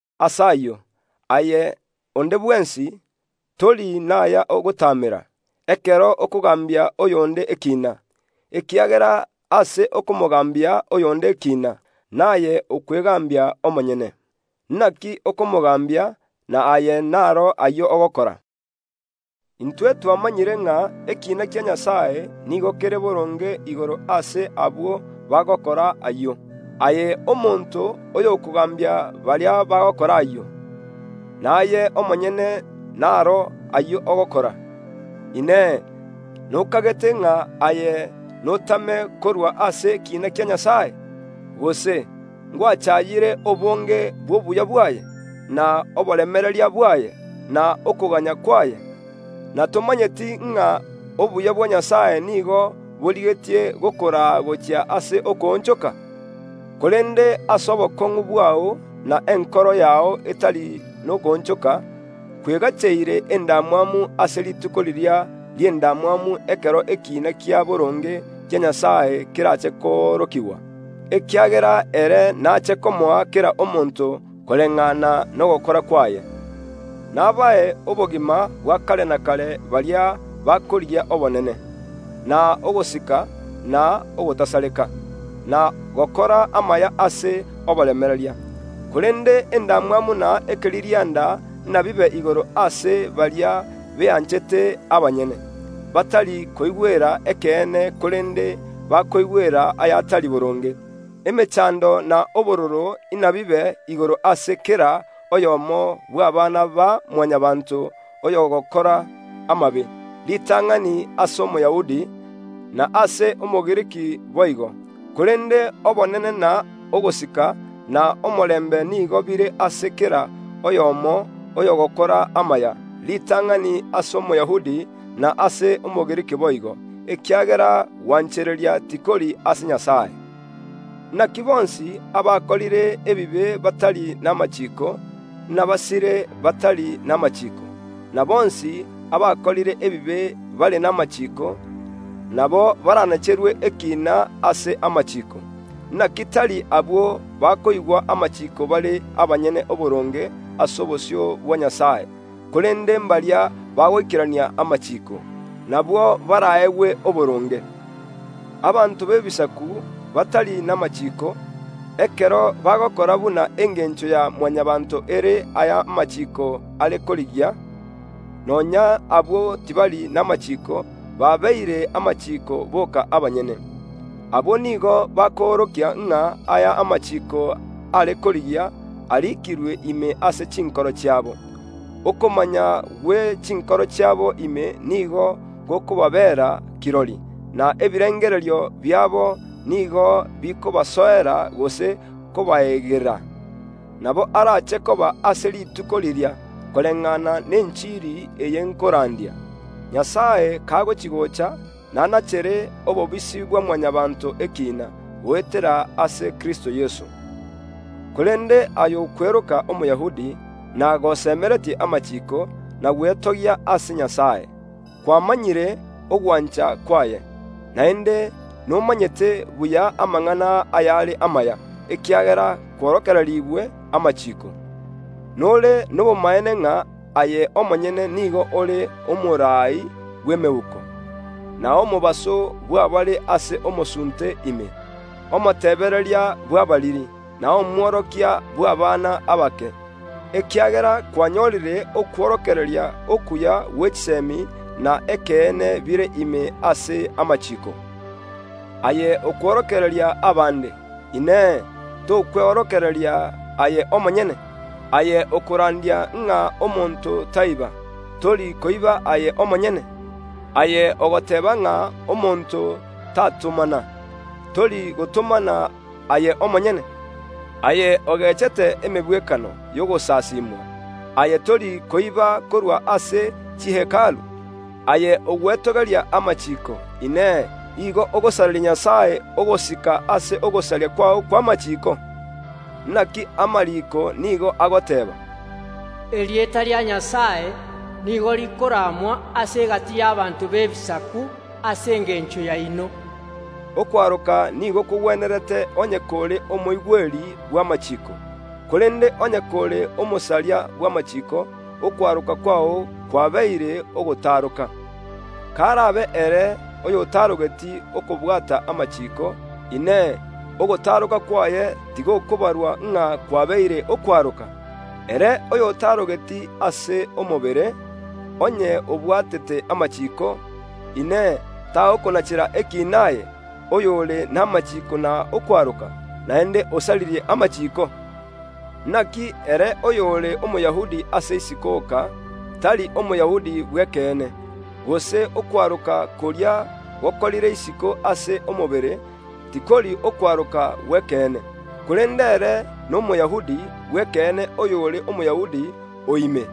Ase ayio, aye onde bwensi, tori naya ogotaamera, ekero okogaambia oyonde ekiina, ekiagera ase okomogaambia oyonde ekiina, naye okwegaambia omonyene. Inaki okomogaambia, na aye naro ayio ogokora? Intwe twamanyire ng’a ekiina kia Nyasae nigo kere boronge igoro ase abwo bagokora ayio. Aye omonto oyokogaambia baria bagokora ayio, naye omonyene naro ayio ogokora, Inee, nokagete ng’a aye notame korwa ase ekiina kia Nyasae? Gose ngwachaayire obonge bw’obuya bwaye, na oboremereria bwaye, na okoganya kwaye, na tomanyeti ng’a obuya bwa Nyasae nigo borigetie gokoraa gochia ase okoonchoka? Korende ase obokong’u bwao na enkoro yao etari nokoonchoka, kwegacheire endamwamu ase rituko riria ri’endamwamu, ekero ekiina kia boronge kia Nyasae kerache koorokigwa, ekiagera ere naache komoa kera omonto koreng’ana nogokora kwaye; nabae obogima bwa kare na kare baria bakorigia obonene, na ogosika, na ogotasareka, na gokora amaya ase oboremereria. Korende endamwamu na ekeririanda inabibe igoro ase baria beanchete abanyene, batari koigwera ekeene, korende bakoigwera ayatari boronge. Emechando na obororo inabibe igoro ase kera oyomo bw’abana ba Mwanyabaanto oyogokora amabe, ritang’ani ase Omoyahudi, na ase Omogiriki boigo; korende obonene na ogosika, na omorembe nigo bire ase kera oyomo oyogokora amaya, ritang’ani ase Omoyahudi, na ase Omogiriki boigo. Ekiagera gwanchereria tikori ase Nyasae. Inaki Abagiriki bakorire ebibe batari namachiiko a Musa, inabasire batari namachiiko; na Abayahudi bakorire ebibe bare namachiiko, nabo baranacherwe ekiina ase amachiiko. Inaki tari abwo bakoigwa amachiiko bare abanyene oboronge ase obosio bwa Nyasae, korende mbaria bagoikerania amachiiko, nabwo baraegwe oboronge. Abanto b’Ebisaku batari namachiiko, ekero bagokora buna engencho ya Mwanyabaanto ere aya amachiiko are korigia, nonya abwo tibari namachiiko, babeire amachiiko boka abanyene. Abwo nigo bakoorokia ng’a aya amachiiko are korigia ariikirwe ime ase chinkoro chiabo. Okomanya gwe chinkoro chiabo ime nigo gokobabera kirori, na ebirengererio biabo nigo bikobasoera gose kobaegerera. Nabo arache koba ase rituko riria, koreng’ana nenchiri eye nkorandia, Nyasae kagochi‐gocha nanachere obobisi bwa Mwanyabaanto ekiina, goetera ase Kristo Yeso. Korende aye okweroka Omoyahudi, na gosemeretie amachiiko, na gwetogia ase Nyasae. Kwamanyire ogwancha kwaye, naende nomanyete buya amang’ana ayare amaya, ekiagera kworokererigwe amachiiko. Nore nobomaene ng’a aye omonyene nigo ore omoraai bw’emeuko, na omobaso bw’abare ase omosunte ime. Omotebereria bw’abariri, na omworokia bw’abana abake, ekiagera kwanyorire okworokereria okuya gwe chisemi na ekeene bire ime ase amachiiko. Aye okworokereria abande, Inee, tokweorokereria aye omonyene? Aye okorandia ng’a omonto taiba, tori koiba aye omonyene? Aye ogoteeba ng’a omonto tatomana, tori gotomana aye omonyene? Aye ogechete emegwekano y’ogosasimwa, aye tori koiba korwa ase chi Hekalu? Aye ogwetogeria amachiiko, Inee, nigo ogosareria Nyasae ogosika ase ogosaria kwao kw’amachiiko? Inaki amariiko nigo agoteeba, “Erieta ria Nyasae nigo rikoramwa ase egati y’ abanto b’Ebisaku ase engencho yaino.” Okwaroka nigo kogwenerete onye kore omoigweri bw’amachiiko, korende onye kore omosaria bw’amachiiko, okwaroka kwao kwabeire ogotaaroka. Karabe ere oyotaarogeti okobwata amachiiko, Inee, ogotaaroka kwaye tigokobarwa ng’a kwabeire okwaroka? Ere oyotaarogeti ase omobere, onye obwatete amachiiko, Inee, tagokonachera ekiina aye, oyore namachiiko na okwaroka, naende osaririe amachiiko? Inaki ere oyore Omoyahudi ase isiko oka, tari Omoyahudi bw’ekeene, gose okwaroka koria gokorire isiko ase omobere, tikori okwaroka gw’ekeene. Korende ere n’Omoyahudi bw’ekeene oyore Omoyahudi o ime,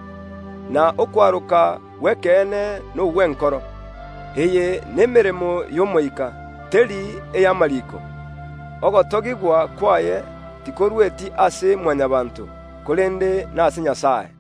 na okwaroka gw’ekeene nogw’enkoro. Eye nemeremo y’Omoika, teri ey’amariiko. Ogotogigwa kwaye tikorueti ase Mwanyabaanto, korende nase Nyasae.